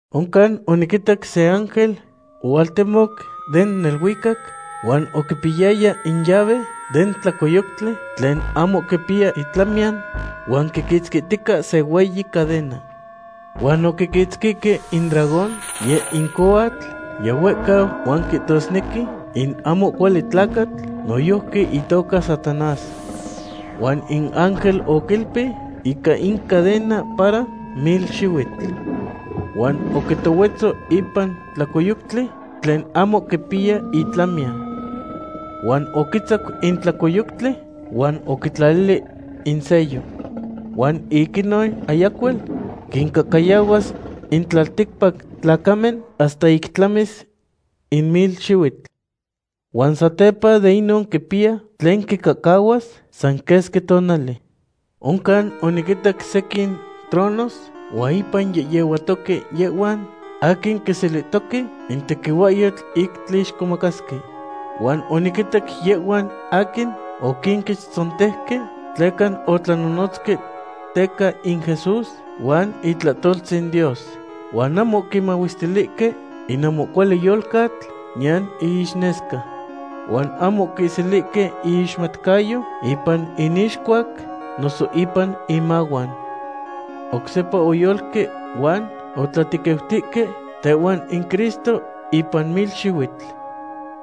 Oncan oniquitac se ángel ohualtemoc den neluicac, huan oquipiyaya in llave den tlacoyoctli tlen ahmo quipiya itlamiyan huan quiquitzquihtica se hueyi cadena. Huan oquiquitzqui in dragón, yeh in cohuatl yihuehcau huan quihtosnequi in ahmo cuali tlacatl noyojqui itoca Satanás. Huan in ángel oquiilpi ica in cadena para mil xihuitl. Huan oquitohuetzo ipan tlacoyoctli tlen ahmo quipiya itlamiyan. Huan oquitzac in tlacoyoctli huan oquitlalili in sello. Huan ic inon ayacuel quincahcayahuas in tlalticpac tlacamen hasta ic tlamis in mil xihuitl. Huan satepa de inon quipiya tlen quicahcahuas san quesqui tonali. Oncan oniquitac sequin tronos huan ipan yehyehuatoque yehhuan aquin quiselihtoque in tequihuahyotl ic tlixcomacasque. Huan oniquinitac yehhuan aquin oquinquechtzontejque tleca otlanonotzque teca in Jesús huan itlahtoltzin Dios. Huan ahmo oquimahuestilihque in ahmo cuali yolcatl, niyan iixnesca. Huan ahmo oquiselihque iixmatcayo ipan inixcuac noso ipan inmahuan. Oc sepa oyolque huan otlatequiutihque tehuan in Cristo ipan mil xihuitl.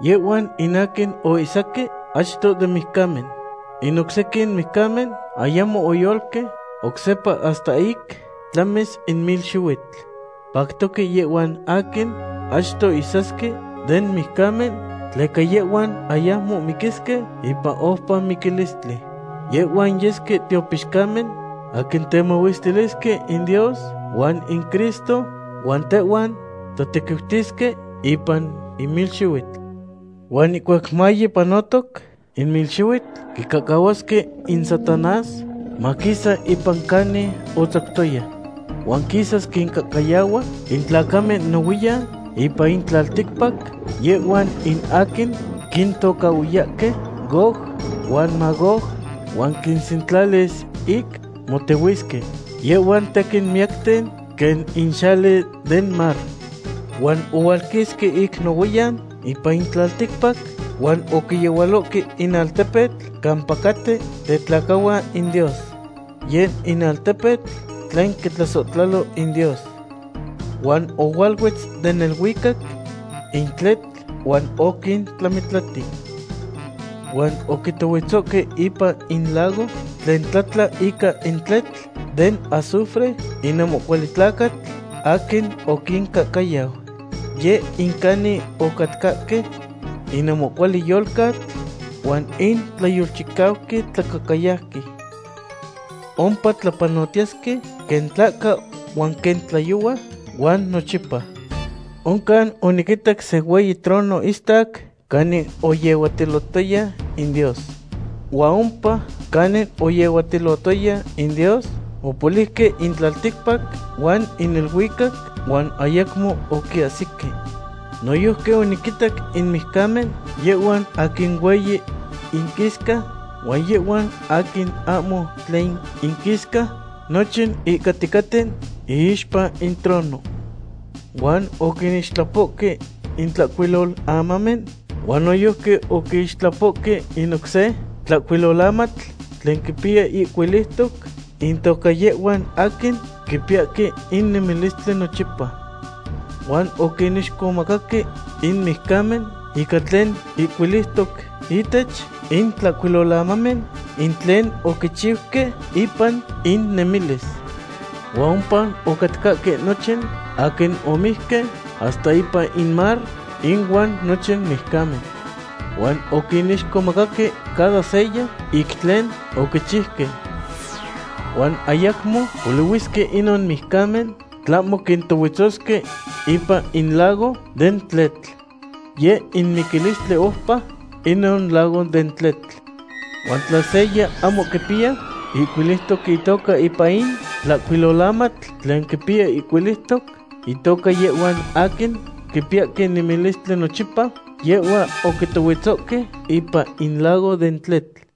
Yehhuan in aquin oihsaque achto den mijcamen. In oc sequin mijcamen ayamo oyolque oc sepa hasta ic tlamis in mil xihuitl. Pactoque yehhuan aquin achto ihsasque den mijcamen tleca yehhuan ayacmo miquisque ipan oupa miquilistli. Yehhuan yesque tiopixcamen aquin temahuestilisque in Dios huan in Cristo, huan tehuan tlatequiutisque ipan in mil xihuitl. Huan ihcuac maye panotoc in mil xihuitl, quicahcahuasque in Satanás maquisa ipan canin otzactoya. Huan quisas quincahcayahua in tlacamen nohuiyan ipan in tlalticpac, yehhuan in aquin quintocahhuiyahque Gog huan Magog, huan quinsentlalis ic motehuisque. Yehhuan tequin miyacten quen in xali den mar. Huan ohualquisque ic nohuiyan ipan in tlalticpac huan oquiyehualohque in altepetl campa caten tetlacahuan in Dios. Yeh in altepetl tlen quitlasohtlalo in Dios. Huan ohualuetz den neluicac in tletl huan oquintlamitlati. Huan oquitohuetzohque ipan in lago tlen tlatla ica in tletl den azufre in ahmo cuali tlacatl aquin oquincahcayau. Yeh in canin ocatcahque in ahmo cuali yolcatl huan in tlayolchicauqui tlacahcayauqui. Ompa tlapanotiyesque quen tlahca huan quen tlayohua huan nochipa. Oncan oniquitac se hueyi trono istac canin oyehuatilotoya in Dios. Huan ompa canin oyehuatilotoya in Dios, opoliuque in tlalticpac huan in neluicac, huan ayacmo oquiahsique. Noyojqui oniquitac in mijcamen, yehhuan aquin hueyi inquisca huan yehhuan aquin ahmo tlen inquisca, nochin ihcaticaten iixpa in trono. Huan oquinixtlapohque in tlahcuilolamamen huan noyojqui oquixtlapohque in oc se tlahcuilolamatl tlen quipiya ihcuiliutoc intoca yehhuan aquin quipiyahque in nemilistli nochipa. Huan oquinixcomacaque in mijcamen ica tlen ihcuiliutoc ihtech in tlahcuilolamamen, in tlen oquichiuque ipan innemilis. Huan ompa ocatcahque nochin aquin omijque hasta ipan in mar inuan nochin mijcamen. Huan oquinixcomacaque cada seya ic tlen oquichiuque. Huan ayacmo polihuisque inon mijcamen, tlahmo quintohuetzosque ipan in lago den tletl. Yeh in miquilistli oupa, inon lago den tletl. Huan in tla seya ahmo quipiya ihcuiliutoc itoca ipan in tlahcuilolamatl tlen quipiya ihcuiliutoc intoca yehhuan aquin quipiyahque nemilistli nochipa, yehhua oquitohuetzohque ipan in lago den tletl.